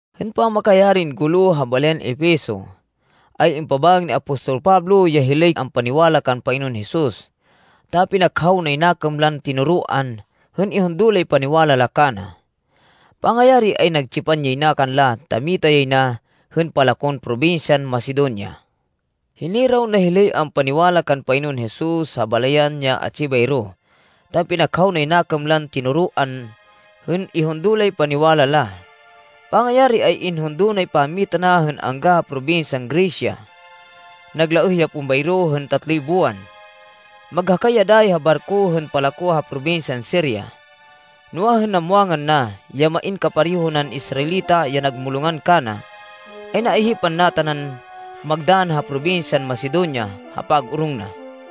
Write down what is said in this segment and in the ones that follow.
Hên pamakayarin gulo ha balayan Efeso, ay impabaêg ni apostol Pablo ya hilay ampaniwala kan Panginoon Jesus, ta pinakhaw nay nakêm lan tinoroan, hên ihundo lay paniwala la kana. Pangayari, ay nagtsipan yay na kanla ta mita yay na hên palakon probinsyan Macedonia. Hiniraw na hilay ampaniwala kan Panginoon Jesus ha balayan ya atsi bayro, ta pinakhaw nay nakêm lan tinoroan, hên ihundo lay paniwala la. Pangayari ay inhundo nay pammita na hên angga ha probinsyan Grecia. Naglaêh ya pon bayro hên tatloy buwan. Maghakay ya dayi ha barko hên palako ha probinsyan Siria, noa, hên namwangan na ya main kapareho nan Israelita ya nagmulongan kana, ay naihipan na tanan magdann ha probinsyan Macedonia ha pag-orong na.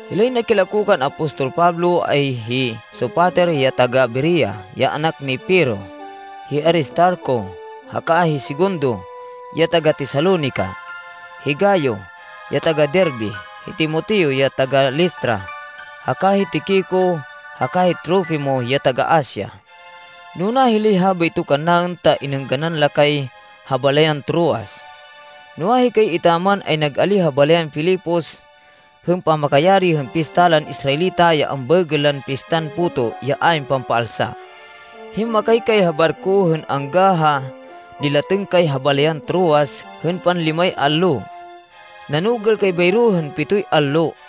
Hilay nakilako kan apostol Pablo, ay hi Sopater ya taga-Berea, ya anak ni Pirro, hi Aristarco haka hi Segundo ya taga-Tesalonica, hi Gayo, ya taga-Derbe, hi Timoteo, ya taga-Listra, haka hi Tiquico haka hi Trofimo, ya taga-Asia. Nuna hilay habayto kannaên ta inêngganan la kay ha balayan Troas. Noa, hikay etaman ay nag-alíh ha balayan Filipos hên pamakayari hên pista lan Israelita ya ambaêgên lan Pistan Puto ya ayn Pampaalsa. Himmakay kay ha barko hên angga ha nilatêng kay ha balayan Troas hên panlimay allo. Nanugêl kay bayro hên pitoy allo.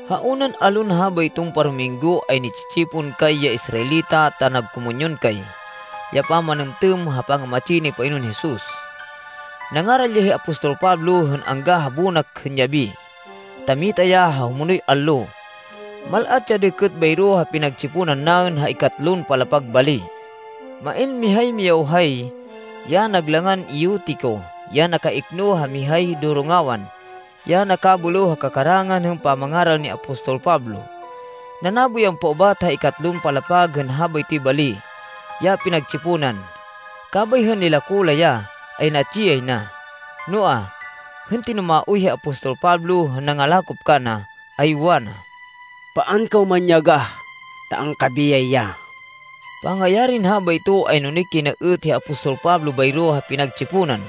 Ha unan allon habayton parominggo ay ni-tsi-tsipon kay ya Israelita ta nagkomunyon kay, ya pamanêmtêm ha pangamatsi ni Panginoon Jesus. Nangaral ya hi apostol Pablo hên angga ha bonak hên yabi, ta mita ya ha humonoy allo. Mal-at ya dêkêt bayro ha pinagtsiponan naên ha ikatlon palapag bali. Main mihay miyawhay, ya nag langan Eutico ya nakaikno ha mihay dorongawan, ya nakabêlêw ha kakarangan hên pamangaral ni apostol Pablo. Nanabo yan paubat ha ikatlon palapag hên habaytoy bali ya pinagtsiponan, kabay hên nilako la ya, ay natsi yay na. Noa, hên tinumaoy hi apostol Pablo hên nangalakop kana, ay wana, “Paan kaw manyagah, ta angkabiyay ya!” Pangayarin habayto, ay nunik yay na êt hi apostol Pablo, bayro ha pinagtsiponan,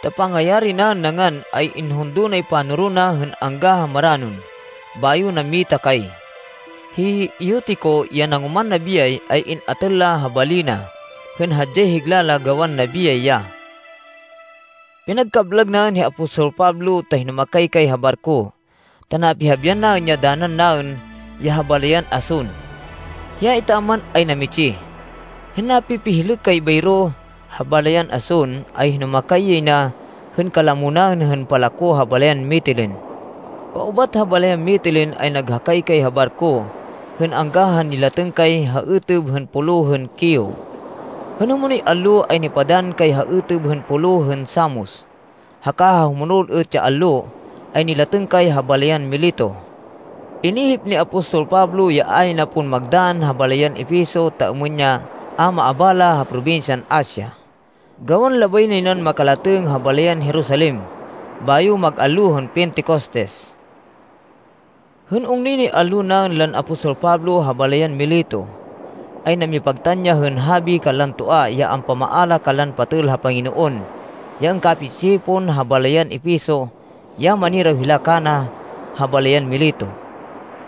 ta pangayari naên nangan, ay inhundo nay panoro na hên angga ha maranon bayo nammita kay. Hi Eutico, ya nangoman nabiyay, ay in-atêl la ha bali na, hên hadyay higla la gawan nabiyay ya. Pinagkablag naên hi apostol Pablo ta hinumakay kay ha barko ta napihabian naên ya danan naên ya ha balayan Ason. Hiya etaman, ay namitsih. Hên napipihlêk kay bayro ha balayan Ason, ay hinumakay yay na hên kalamo naên hên palako ha balayan Mitilene. Paubat ha balayan Mitilene ay naghakay kay ha barko hên angga ha nilatêng kay ha êtêb hên Pulo hên Quio. Hên humonoy allo, ay nipadann kay ha êtêb hên Pulo hên Samos, haka ha humonol êt ya allo ay nilatêng kay ha balayan Mileto. Inihip ni apostol Pablo ya a yay na pon magdann ha balayan Efeso ta êmên ya a maabala ha probinsyan Asia, gawan labay nay nan makalatêng kay ha balayan Jerusalem bayo mag allo hên Pentecostes. Hên ungnoy nay allo naên lan apostol Pablo ha balayan Mileto, ay namipagtan ya hên habi kanlan toa ya ampamaala kanlan patêl ha Panginoon ya angkapi-tsi-tsipon ha balayan Efeso ya maniraw hila kana ha balayan Mileto.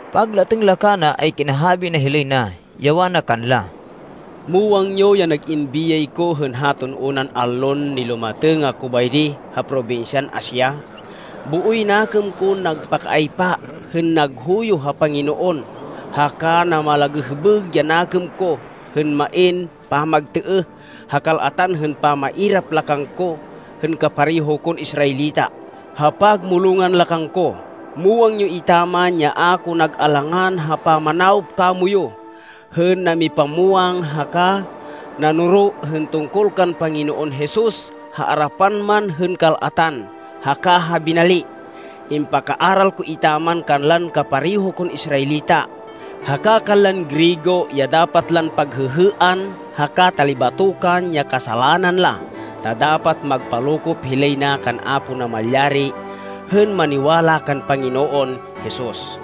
Paglatêng la kana ay kinahabi na hilay na, ya wana kanla, “Muwang yo ya nag-in biyay ko hên haton unan allon nilumatêng ako bayri ha probinsyan Asia. Booy nakêm kon nagpakaaypa hên naghuyo ha Panginoon haka namalagêhbêg ya nakêm ko hên main pamagtêêh ha kal-atan hên pamairap la kangko hên kapareho kon Israelita ha pagmulongan la kangko. Muwang yo etaman ya a ko nag-alangan ha pamanawop kamoyu hên namipamwang haka nanoro hên tungkol kan Panginoon Jesus ha arapan man hên kal-atan haka ha binali. Impakaaral ko etaman kanlan kapareho kon Israelita, haka kanlan Griego ya dapat lan paghêhêan haka talibatokan ya kasalanan la, ta dapat magpalokop hilay na kan Apo Namalyari hên maniwala kan Panginoon Jesus.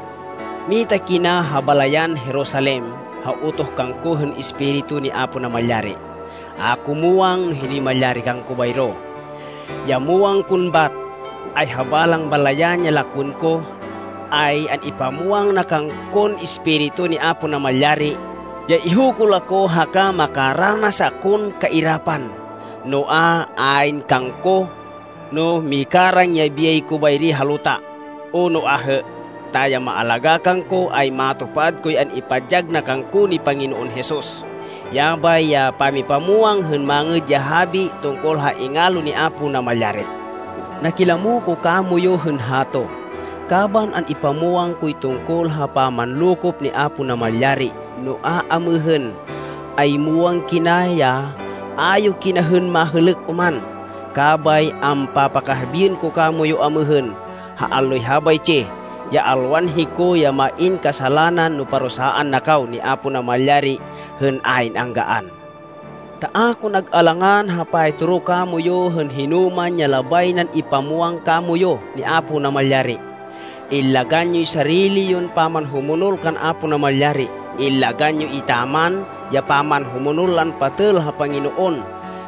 “Mita kina ha balayan Jerusalem ha utoh kangko hên Espiritu ni Apo Namalyari. A ko muwang no hinoy malyari kangko bayro. Ya muwang kon bat, ay ha balang balayan ya lakwên ko, ay an-ipamwang na kangkon Espiritu ni Apo Namalyari, ya ihukul ako haka makaranas akon kairapan. Noa, ayn kangko no mikarang ya biyay ko bayri ha luta o no ahê, ta ya maalagá kangko ay matupad koy an-ipadyag na kangko ni Panginoon Jesus. Yabay ya pamipamwang hên Mangêd ya Habi tungkol ha ingalo ni Apo Namalyari. “Nakilamo ko kamoyu hên hato, kaban an-ipamwang koy tungkol ha pamanlokop ni Apo Namalyari. Noa, amêhên ay muwang kina ya a yo kina hên mahêlêk oman. Kabay ampapakahabiên ko kamoyu amêhên, ha alloy habaytsi, ya alwan hiko ya main kasalanan no parusaan na kaw ni Apo Namalyari hên ayn anggaan. Ta a ko nag-alangan ha paytoro kamoyu hên hinoman ya labay nan ipamwang kamoyu ni Apo Namalyari. Illagan yoy sarili yon pamanhumonol kan Apo Namalyari. Illagan yo etaman ya pamanhumonol lan patêl ha Panginoon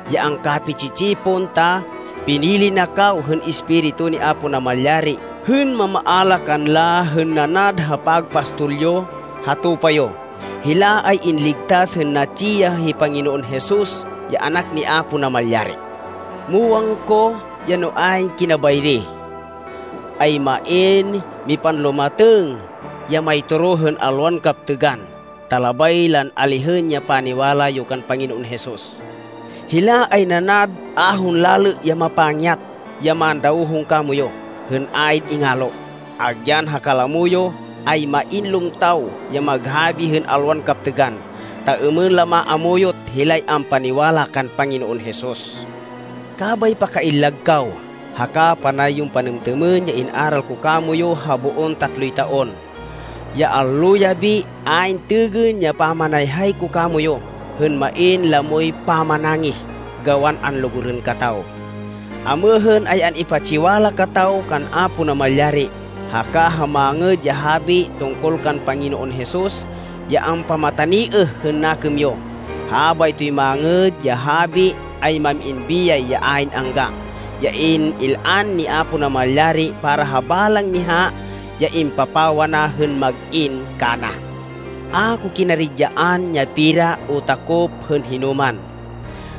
ya angkapi-tsi-tsipon, ta pinili na kaw hên Espiritu ni Apo Namalyari hên mamaala kanla hên nanad ha pagpastol yo, ha tupa yo. Hila ay inligtas hên natsi ya hi Panginoon Jesus ya Anak ni Apo Namalyari. Muwang ko, ya no ayn kina bayri, ay main mipanlumatêng ya maytoro hên alwan kaptêgan, ta labay lan alihên ya paniwala yo kan Panginoon Jesus. Hila ay nanad ahon lalê ya mapangyat ya mandawhong kamoyu hên ayn ingalo. Agyan ha kalamo yo, ay main lumtaw ya maghabi hên alwan kaptêgan, ta êmên la maamuyot hilay ampaniwala kan Panginoon Jesus. Kabay pakaillag kaw, haka panay yon panêmtêmên ya in-aral ko kamoyu ha boon tatloy taon, ya allo-yabi ayn têgên ya pamanayhay ko kamoyu, hên main lamoy pamanangih gawan anlugurên kataw. “Amêhên, ay an-ipatsiwala kataw kan Apo Namalyari, haka ha Mangêd ya Habi tungkol kan Panginoon Jesus ya ampamataniêh hên nakêm yo. Habaytoy Mangêd ya Habi, ay mam-in biyay ya ayn angga, ya in-il-an ni Apo Namalyari para ha balang miha ya impapawa na hên mag-in kana. A ko kinaridyaan ya pera o takop hên hinoman.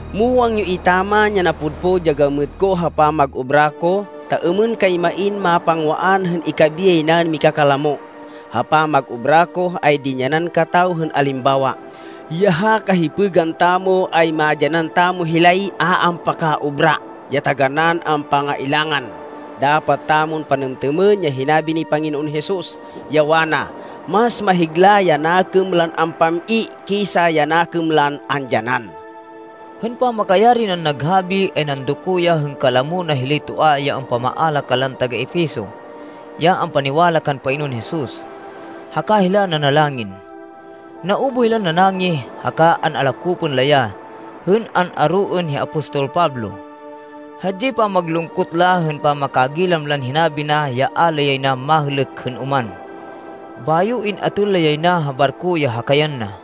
Muwang yo etaman ya napudpud ya gamêt ko ha pamag-obra ko ta êmên kay main mapangwaan hên ikabiyay naên mikakalamo. Ha pamag-obra ko, ay dinyanan kataw hên alimbawa, ya ha kahipêgan tamo ay madyanan tamo hilay a ampaka-obra ya taganán ampangailangan. Dapat tamon panêmtêmên ya hinabi ni Panginoon Jesus, ya wana, ‘Mas mahigla ya nakêm lan ampam-i kisa ya nakêm lan andyanan.’” Hên pamakayari nan naghabi, ay nandoko ya hên kalamo na hilay toa ya ampamaala kanlan taga-Efeso ya ampaniwala kan Panginoon Jesus, haka hila nanalangin. Naubuh hilan nanangih, haka an-alakopên la ya hên an-aroên hi apostol Pablo. Hadyay pamag-lungkot la hên pamakagilam lan hinabi na ya a la yay na mahêlêk hên oman. Bayo in-atêl la yay na ha barko ya hakayan na.